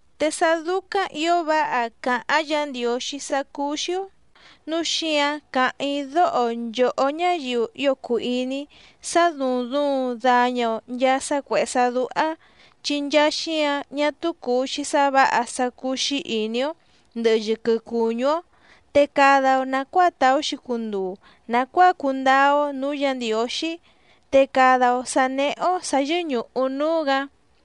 Te sá dúcáⁿ ǐo váha càháⁿ Yǎ Ndiǒxí sá cúú‑xí‑ó nǔu xíǎⁿ càháⁿ‑í dóho nchòhó ñáyiu ío cùu iní‑í sá dùuⁿ duuⁿ daña‑o nchaa sá cuèhé sá dúhá, chi nchaa xíǎⁿ ñá túú cùu‑xi sá vǎha sá cúú‑xí ìní‑ó ndɨ̀hɨ yɨquɨ cuñú‑ó, te cada‑o nàcuáa tàú‑xi cunduu nàcuáa cundáá‑ó nǔú Yǎ Ndiǒxí, te cada‑o sǎ néhé‑ó sǎ yɨ́ñùhu núú‑gǎ.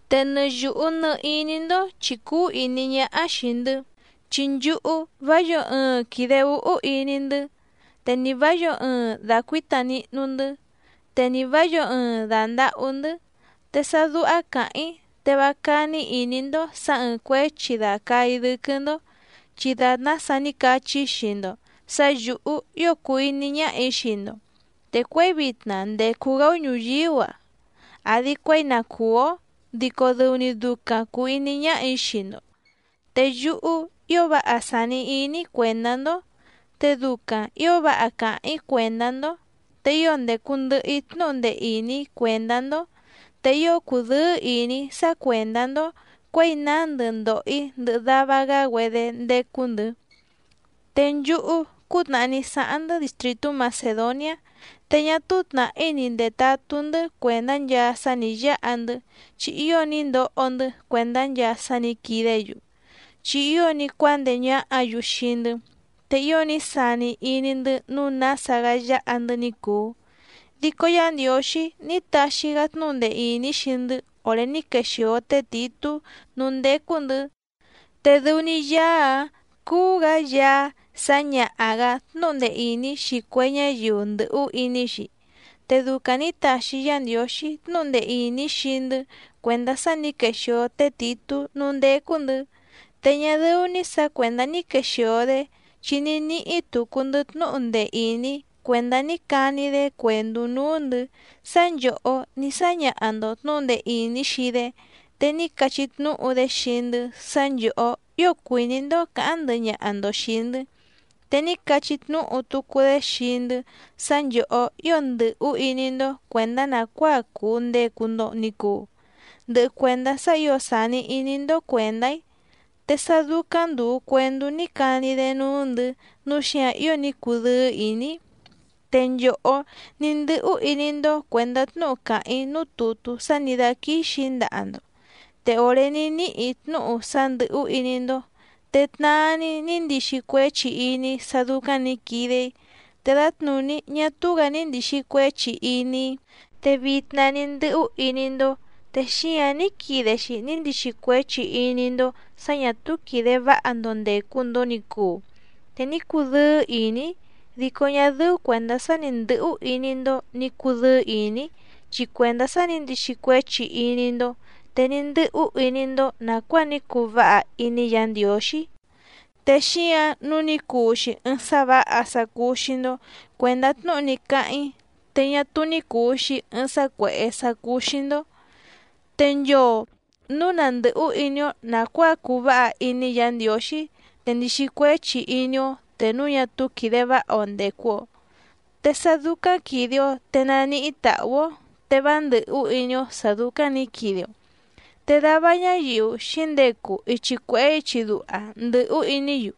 Te nɨ yùhu nɨ iní‑ndó chì cúú ìní ñáhá xìi‑ndɨ́, chi nchúhú vá yǒo ɨɨⁿ quìde úhú iní‑ndɨ́, te ni vǎ yǒo ɨɨⁿ dàcuíta nihnu‑ndɨ́, te ni vǎ yǒo ɨɨⁿ dàndahú‑ndɨ́. Te sá dúhá càháⁿ‑í te vá cání ìní‑ndó sǎ ɨ̀ɨⁿ cuéchi dàcaa‑í dɨ́quɨ́‑ndó, chi dàtná sa ní cachí‑í xii‑ndo sǎ yǔhú ío cùu iní ñáhà‑í xii‑ndo, te cuěi vitna ndècu‑gá‑ó ñùyíú‑a àdi cuéi na cùú‑ó dico dɨu‑ni ducaⁿ cùu iní ñáhà‑í xii‑ndo. Te yúhú ío váha sàni iní‑í cuèndá‑ndó, te ducaⁿ ǐo váha càháⁿ‑í cuèndá‑ndó, te ío ndècu ndɨhɨ‑í tnúhu ndee ìní cuèndá‑ndó, te ío cùdɨ́ɨ́ ìní‑í sá cuèndá‑ndó cuěi nándɨ ndòho‑í ndɨhɨ dava‑gá‑güedé ndécú‑ndɨ̌. Te nchúhú cútnàhá ní sáháⁿ‑ndɨ́ distrìtú Macèdoniá, te ñá túú tnàhí ni ndètatú‑ndɨ́ cuèndá nchaa sá nǐ yáhandɨ chi ío ní ndoho‑ndɨ́ cuèndá nchaa sá nǐ quidé‑yu, chi ío ní cuándeé ñáhǎ‑yu xii‑ndɨ́, te ío ní sani iní‑ndɨ́ nǔu nása‑gá yáha‑ndɨ́ ní cùu. Dico Yá Ndiǒxí ní taxi‑gá tnúhu ndee ìní xii‑ndɨ́ òré ní quexìo té Tìtú núú ndécú‑ndɨ̌, te dɨu‑ni Yaá‑áⁿ cúú‑gǎ Yaá sǎñaha‑gǎ tnúhu ndee ìní xii cue ñáyiu ndɨ̀hú iní‑xi. Te ducaⁿ nǐ taxi Yá Ndiǒxí tnúhu ndee ìní xii‑ndɨ́ cuèndá sá nǐ quexìo té Tìtú núú ndécú‑ndɨ̌, te ñá dɨ́ú‑ní sǎ cuèndá ní quexìo‑dé chi ní níhí tucu‑ndɨ́ tnúhu ndee ìní cuèndá ní cani‑dé cuèndú núú‑ndɨ̌ sá nchòhó ní sáñaha‑ndo tnǔhu ndee ìní xii‑dé, te ní cachí tnúhu‑dé xii‑ndɨ́ sá nchòhó ío cuìní‑ndó cǎháⁿ ndɨhɨ ñaha‑ndo xìi‑ndɨ́, te ní cachí tnúhu tucu‑dé xii‑ndɨ́ sá nchòhó ío ndɨ̀hú iní‑ndó cuèndá nàcuáa cùu ndecu‑ndo ni cuu, ndɨhɨ cuèndá sá ǐo sàni iní‑ndó cuèndá‑í, te sá dúcáⁿ ndùu cuendú ní cani‑dé núú‑ndɨ̌ nǔu xíǎⁿ ío ní cudɨ́ɨ́ ìní‑í. Te nchòhó ní ndɨ́hú iní‑ndó cuèndá tnúhu càháⁿ‑í núú tùtú sá nǐ dáquíxì‑í ndaha‑ndo, te òré ní níhì‑í tnúhu sá ndɨ̀hú iní‑ndó te tnaa‑ni ní ndixi cuéchi iní‑í sá dúcáⁿ nǐ quide‑í te dǎtnùní ñá túú‑gǎ ní ndìxi cuéchi iní‑í. Te vitna ní ndɨ́hú iní‑ndó, te xíǎⁿ ní quide‑xi ní ndixi cuéchi iní‑ndó sǎ ñà túú quìde váha‑ndo ndècu‑ndo ni cuu, te ní cudɨ́ɨ́ ìní‑í dico ñá dɨ́ú cuèndá sá ni ndɨ̌hú iní‑ndó nǐ cudɨ́ɨ́ ìní‑í chi cuèndá sá nǐ ndixi cuéchi iní‑ndó, te ní ndɨ́hú iní‑ndó nàcuáa ní cuu váha iní Yǎ Ndiǒxí, te xíǎⁿ nǔu ní cuu‑xi ɨɨⁿ sá vǎha sá cúú‑xí‑ndó cuèndá tnúhu ní cáháⁿ‑í te ñá túú ní cùu‑xi ɨɨⁿ sá cuèhé sá cúú‑xí‑ndó. Te nchoo nǔu na ndɨ̀hú iní‑ó nàcuáa cuu váha iní Yǎ Ndiǒxí, te ndìxi cuéchi iní‑ó te núu ñá túú quìde váha‑o ndècu‑o, te sá dúcáⁿ quìde‑o te nàníhí tàhú‑ó, te vá ndɨ̀hú iní‑ó sǎ dúcáⁿ nǐ quide‑o, te dava ñáyiu xǐndecu ichi cuèhé ichi duha ndɨ̀hú iní‑yu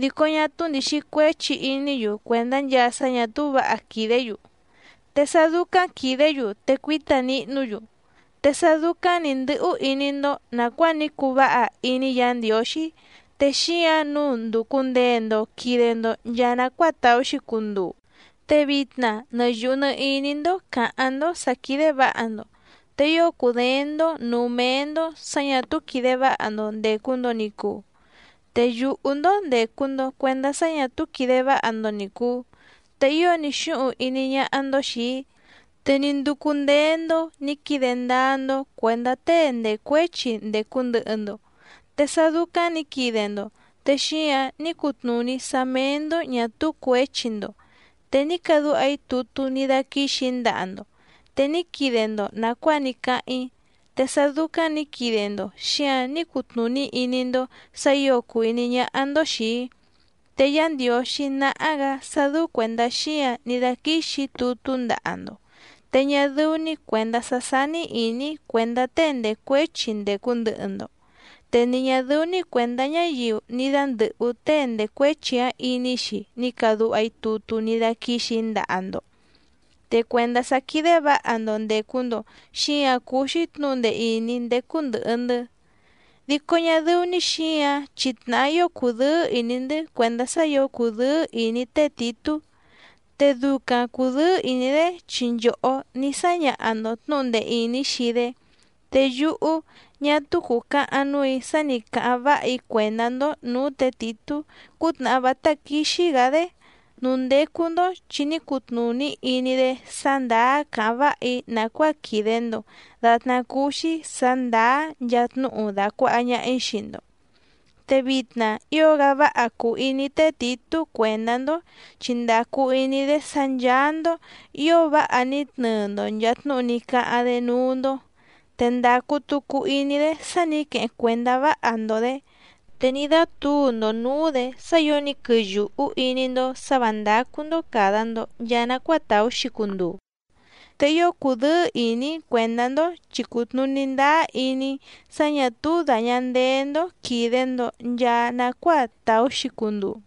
dico ñá túú ndìxi cuéchi iní‑yu cuèndá nchaa sá ñà túú vǎha quìdé‑yu, te sá dúcáⁿ quìdé‑yu te cuíta nihnú‑yu. Te sá dúcáⁿ nǐ ndɨ́hú iní‑ndó nàcuáa ní cuu váha iní Yǎ Ndiǒxí, te xíǎⁿ nǔu ndùcu ndee‑ndo quide‑ndo nchaa nacuáa tàú‑xi cunduu, te vitna nɨ yùhu nɨ iní‑ndó càháⁿ‑ndó sǎ quídé vǎha‑ndo, te ío cùdééⁿ‑ndó nǔú méé‑ndó sǎ ñà túú quìde váha‑ndo ndècu‑ndo ni cuu, te yùhú‑ndó ndècu‑ndo cuendá sá ñà túú quìde váha‑ndo ni cùu, te ío ní xúhuⁿ iní ñáhá‑ndó xìi‑í, te ní ndúcú ndéé‑ndó nǐ quide ndáá‑ndó cuèndá tée ndècuéchi ndècu ndɨhɨ‑ndo, te sá dúcáⁿ nǐ quide‑ndo te xíǎⁿ ní cutnùní sá méé‑ndó ñà túú cuěchi‑ndo. Te ní cadúha‑í tutú ní dáquíxì‑í ndaha‑ndo, te ní quide‑ndo nàcuáa ní cáháⁿ‑í, te sá dúcáⁿ nǐ quide‑ndo xíǎⁿ ní cutnùní iní‑ndó sǎ ǐo cùu iní ñáhá‑ndó xìi‑í. Te Yá Ndiǒxí náhá‑gǎ sá dɨ́ú cuèndá xíǎⁿ ní dáquíxì‑í tutú ndaha‑ndo, te ñá dɨ́ú‑ní cuèndá sá sání ìní‑í cuèndá tée ndècuéchi ndècu ndɨhɨ‑ndo, te ni ñà dɨ́ú‑ní cuèndá ñáyiu ní dándɨ̀hú tée ndècuéchi‑áⁿ iní‑xi ní càdúha‑í tutú ní dáquíxì‑í ndaha‑ndo. Te cuèndá sá quídé vǎha‑ndo ndècu‑ndo xíǎⁿ cúú‑xí tnǔhu ndee ìní ndécú ndɨ̀hɨ‑ndɨ́. Dico ñá dɨ́ú‑ní xǐǎⁿ chi tnàhá ío cùdɨ́ɨ́ ìní‑ndɨ́ cuèndá sá ǐo cùdɨ́ɨ́ ìní té Tìtú, te ducaⁿ cùdɨ́ɨ́ ìní‑dé chi nchòhó ní sáñaha‑ndo tnǔhu ndee ìní xii‑dé. Te yúhú ñá túú cùcahaⁿ núù‑í sá nì cáháⁿ váha‑í cuèndá‑ndó nǔú tě Tìtú cútnàhá vátá quíxí‑gǎ‑dé núú ndécú‑ndó, chi ní cutnùní iní‑dé sá ndàá càháⁿ váha‑í nàcuáa quìde‑ndo datná cúú‑xí sǎ ndàá nchaa tnúhu dàcuaha ñaha‑í xii‑ndo. Te vitna ío‑gá váha cùu iní té Tìtú cuèndá‑ndó, chi ndàcu iní‑dé sá ncháá‑ndó ǐo váha ní tnɨɨ‑ndo nchàa tnúhu ní cáháⁿ‑dé núú‑ndó, te ndàcu tucu iní‑dé sá nǐ queheⁿ cuèndá váha‑ndo‑dě, te ní dátǔu‑ndo nǔú‑dě sá ǐo ní quɨyùhú iní‑ndó sǎ vǎ ndácú‑ndó càda‑ndo nchaa nacuáa tàú‑xi cunduu. Te ío cùdɨ́ɨ́ ìní‑í cuèndá‑ndó chi cùtnuní ndáá iní‑í sá ñà túú dàña ndeé‑ndó quìde‑ndo nchaa nacuáa tàú‑xi cunduu.